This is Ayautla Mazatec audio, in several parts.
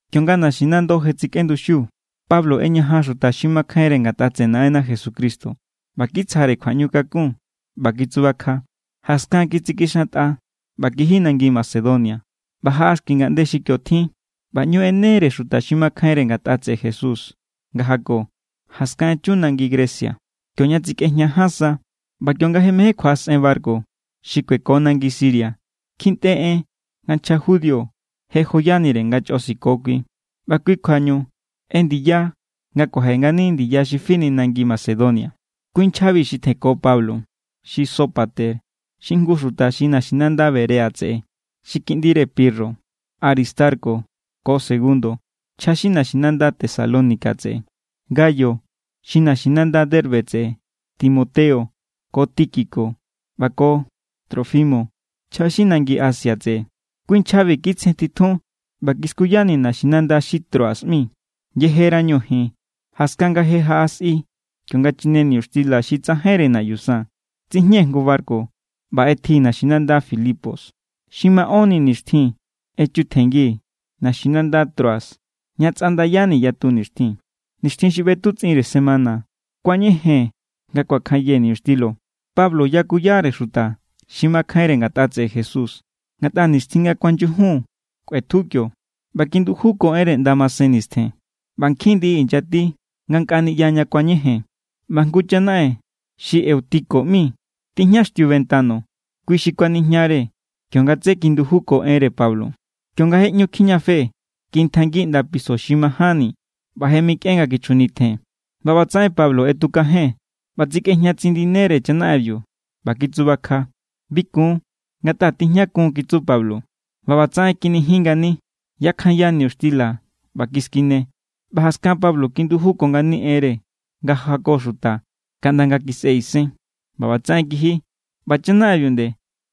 Kionga naxinando je tsikꞌenduxiu, Pablo ꞌeñajan xuta xi makjainre ngatꞌa tseꞌe Naꞌenna Jesucristo ꞌba kitsjare kjuaꞌñukakun ꞌba kitsubakja. Jaskan, kitsikixantꞌa ꞌba kiji nangi Macedonia. ꞌBa jaꞌa xki ngaꞌnde xi kio tjin ꞌba ꞌñu ꞌenere xuta xi makjainre ngatꞌa tseꞌe Jesús nga jako. Jaskan echu nangi Grecia kioña tsikꞌejña ján sa. ꞌBa kionga je mején kjuaꞌasꞌen barku xi kueko nangi Siria, kjintꞌe en nga nchja judío je joyanire nga chꞌo siko kui. ꞌBa kui= kjuañu ꞌendiya nga kuaje ngani ndiya xi fini nangi Macedonia. Kui nchjabi xi tjenko Pablo, xi Sópater xi jngu xuta xi naxinanda Berea tseꞌe xi kiꞌndire Pirro, Aristarco ko Segundo (nchja xi naxinanda Tesalónica tseꞌe), Gayo xi naxinanda Derbe tseꞌe, Timoteo, ko Tíquico ꞌba ko Trófimo (nchja xi nangi Asia tseꞌe). Kui nchjabi kitsjentitjun ꞌba kiskuyani̱ naxinanda xi Troas ꞌmi. Yejerañu ji̱n, jaskan nga je jaꞌa sꞌi kionga chine niñuxtila xi tsajainre naꞌyu san, tsijñee̱ jngu barku ꞌba ꞌetjii̱ naxinanda Filipos. Xi maꞌónni nixtjin echutjenngii̱ naxinanda Troas, ña tsꞌandayani̱ yatu nixtjin. Nixtjin xi ꞌbetutsꞌinre semana kuañejee̱n nga kuakjanyee̱ niñuxtila. Pablo yakuyare xuta xi makjainre ngatꞌa tseꞌe Jesús, ngatꞌa nixtjin nga ku̱anyujun kꞌuetju kio. ꞌBa kindujuko enre ꞌnda masen nistjen. ꞌBa nkjin ndiꞌi inyati ngankꞌa niꞌya ña kuañejee̱n. ꞌBa jngu chanaꞌen xi Eutico ꞌmi tijñaxtiu ventano. Kui xi kuanijñare kionga tsé kindujuko enre Pablo. Kionga je ꞌñu tikijñafe, kintjainngi ꞌnda piso xi majánni, ꞌba je mikꞌen nga kichjunitjen. ꞌBa ꞌbatsaꞌen Pablo ꞌetukajen= ꞌba tsikꞌejña tsindinere chanaꞌenbiu ꞌba kitsubakja. —Bi kun, ngatꞌa tijñakun —kitsu Pablo. ꞌBa ꞌbatsaꞌen kinijin ngani. Yakjanya niñuxtila ꞌba kiskine, ꞌba jaskan Pablo kindujuko ngani enre nga jako xuta kaꞌnda nga kisꞌe isen, ꞌba ꞌbatsaꞌen kiji. ꞌBa chanaꞌenbiu nde,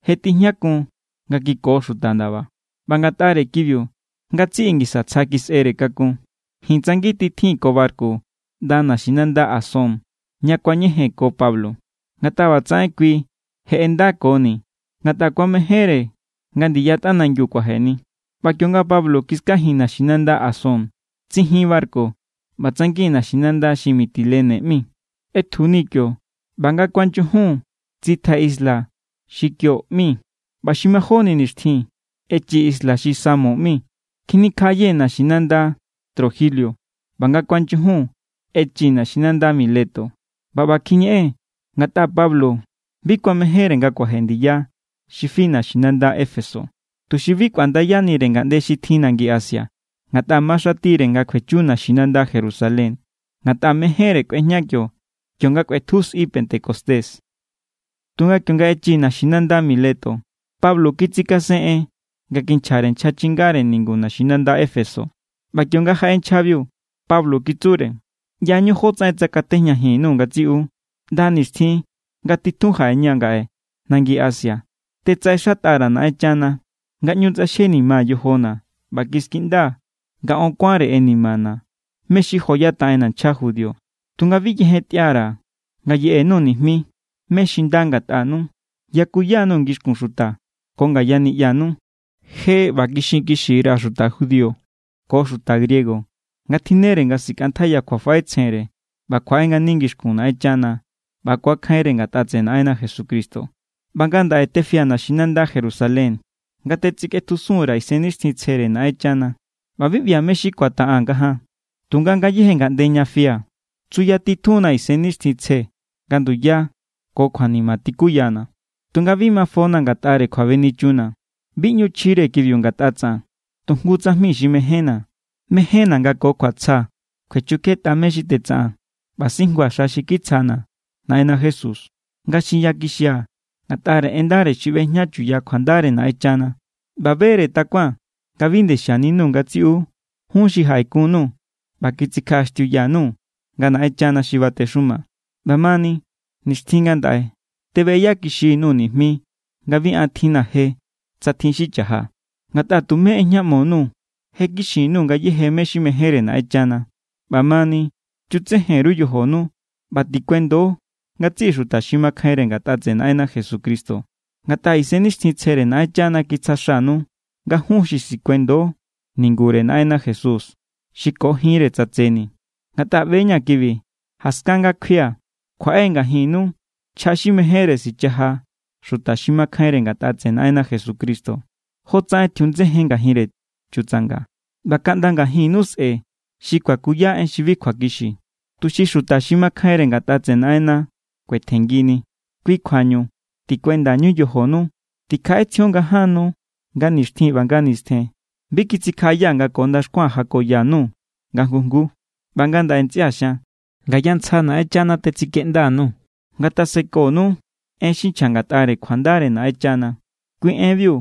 je tijñakun nga kiko xuta ndaba, ꞌba ngatꞌare kibiu ngatsiꞌi ngisa tsja kisꞌere kakun. Ji̱n tsangintitjii̱n ko barku ꞌnda naxinanda Asón, ña ku̱añejee̱n ko Pablo. Ngatꞌa ꞌbatsaꞌen kui je ꞌendakoni̱, ngatꞌa kuamejénre nga ndiya tꞌanangi kuajeni. ꞌBa kionga Pablo kiskajii̱n naxinanda Asón, tsijin barku ꞌba tsangi̱n naxinanda xi Mitilene ꞌmi. ꞌEtjuni̱ kio ꞌba nga kuanyujun tsitjai̱ isla xi Quío ꞌmi, ꞌba xi majóni nixtjin echii̱ isla xi Samos ꞌmi. Kjinikjaꞌayee̱ naxinanda Trogilio ꞌba nga kuanyujun echii̱ naxinanda Mileto. ꞌBa ꞌba kjiñeꞌee̱n ngatꞌa Pablo bi kuamejénre nga kuaje ndiya xi fi naxinanda Éfeso, tuxi bi kꞌuandayanire ngaꞌnde xi tjin nangi Asia. Ngatꞌa maxatire nga kjuechu naxinanda Jerusalén, ngatꞌa mejénre kꞌuejña kio kionga kꞌuetju sꞌi pentecostés. Tunga kionga echii̱ naxinanda Mileto, Pablo kitsikasen en nga kinchjare nchja chingare ningu naxinanda Éfeso. ꞌBa kionga jaꞌe nchjabiu, Pablo kitsure: —ꞌYañu jotsaꞌen tsakatejñajin_nuu̱ ngatsiꞌu ꞌnda nixtjin nga titjun jaꞌeña̱ ngaꞌe nangi Asia. Tetsaꞌexatꞌa_ra̱ Naꞌenchana nga ꞌñu tsꞌaxjenimaa̱ yojona̱, ꞌba kiskiꞌndaa̱ nga on kuánre inimana̱ mé= xi joyataꞌenna̱ nchja judío. Tunga bi yejentꞌia_ra̱ nga yeꞌe_nuu̱ nijmi mé= xi nda ngatꞌanu. Yakuya_nuu̱ ngixkun xuta ko ngaya niꞌyanu. Je ꞌba kixinkixi_ra̱ xuta judío ko xuta griego nga tjinnere nga sikꞌantjaiya kjuafaꞌetsjenre ꞌba kjuaꞌe ngani ngixkun Naꞌenchana ꞌba ku̱akjainre ngatꞌa tseꞌe Naꞌenna Jesucristo. ’ꞌBa ngandaꞌe tefia̱ naxinanda Jerusalén nga tetsikꞌetjusun_ra̱ Isennixtjintsjere Naꞌenchana. ꞌBa bi ꞌbia̱ mé= xi ku̱ataꞌaa̱n ngajaan. Tunga ngayéje ngaꞌnde ña fia̱ tsuyatitjunna̱ Isennixtjintsje nga nduya ko kjuanima tikuyana̱. Tunga bi mafona̱ ngatꞌare kjuabenichunna̱. Bi ꞌñu chjire kibiu ngatꞌa tsaꞌan. Tu jngu tsajmi xi mejénna̱, mejénna̱ nga ko kjuatsja kjuechukjetꞌa mé= xi tetsaꞌaa̱n ꞌba sijnguaa̱ xa xi kitsjana̱ Naꞌenna Jesús, nga xinkixia̱ ngatꞌare en ndare xi ꞌbejña chuya kjuandare Naꞌenchana. ’ꞌBa be=re takuaa̱n nga bi nde xianinuu̱ ngatsiꞌu jun xi jaꞌekun_nuu̱ ꞌba kitsikjaꞌaxtiuya_nuu̱ nga Naꞌenchana xi batexuma. ꞌBamani, nixtjin ngandaꞌe tebeꞌeyakixi_nuu̱ nijmi nga bi an tjinna̱ je, tsa tjin xi cha̱ja. Ngatꞌa tumé ꞌejñaꞌmo_nuu̱. Je kixin_nuu̱ ngayéje mé= xi mejénre Naꞌenchana. ’ꞌBamani, chutsejen_ru yojonu ꞌba tikuendo ngatsiꞌi xuta xi makjainre ngatꞌa tseꞌe Naꞌenna Jesucristo. Ngatꞌa Isennixtjintsjere Naꞌenchana kitsja xanu nga jun xi sikuendo ningure Naꞌenna Jesús, xi ko jinre tsatseni. Ngatꞌa ꞌbe=ña̱ kibi. Jaskan nga kjuia̱, kjuaꞌe ngajinnu nchja xi mejénre sichaja xuta xi makjainre ngatꞌa tseꞌe Naꞌenna Jesucristo, jotsaꞌen tjiundsejen ngajinre chutsanga. ꞌBa kaꞌnda ngajinnu sꞌe̱ xi kuakuya en xi bi kjuakixi, tuxi xuta xi makjainre ngatꞌa tseꞌe Naꞌenna kuetjenngini. Kui kjuañu tikuendañu yojonu. Tikjaꞌetsjion nga ján nu, nga nixtjin ꞌba nga nistjen, bi kitsikjaꞌayaa̱ nga ko ndaxkua̱n jakoya_nuu̱ nga jngu jngu. ’ꞌBa ngandaꞌe, ntsꞌia̱ xian, ngaya ntsja Naꞌenchana tetsikeꞌnda_nuu̱. Ngatasekonu en xi nchja ngatꞌare kjuandare Naꞌenchana, kui enbiu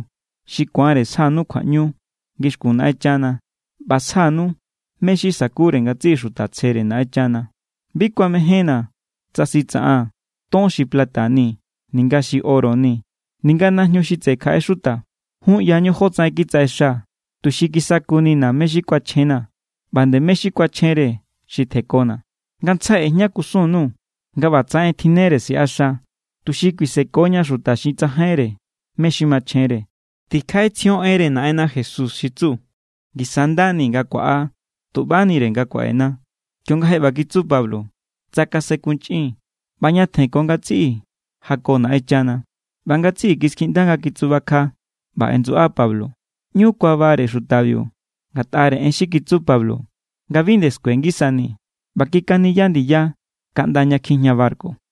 xi ku̱anre sjanu kjuaꞌñu ngixkun Naꞌenchana ꞌba sjanu mé= xi sa̱kure ngatsiꞌi xuta tsjere Naꞌenchana. Bi kuamejénna̱ tsa sitsaꞌaa̱n ton xi plata ni ninga xi oro ni ninga najñu xi tseꞌe kjaꞌe xuta. Jun ꞌyañu jotsaꞌen kitsaꞌexaa̱ tuxi kisakunina̱ mé= xi kuachjena̱ ꞌba nde mé= xi kuachjenre xi tjenkona̱. Ngantsjai ꞌejña kusun_nuu̱ nga ꞌbatsaꞌen tjinnere siꞌaxa, tuxi kuisekoña xuta xi tsajainre mé= xi machjenre. Tikjaꞌetsjion enre Naꞌenna Jesús xi tsu: “Ngisa= nda ni nga kuaꞌa tuꞌbanire nga kuaꞌena.” Kionga je ꞌba kitsu Pablo, tsakasenkunchꞌin ꞌba ñatjen ko ngatsiꞌi jako Naꞌenchana. ꞌBa ngatsiꞌi kiskiꞌnda nga kitsubakja ꞌba ꞌendsuꞌa Pablo. ꞌÑu kuabare xutabiu ngatꞌare en xi kitsu Pablo nga bi nde skue ngisanii̱. ꞌBa kikaniya ndiya kaꞌnda ña kijña barku.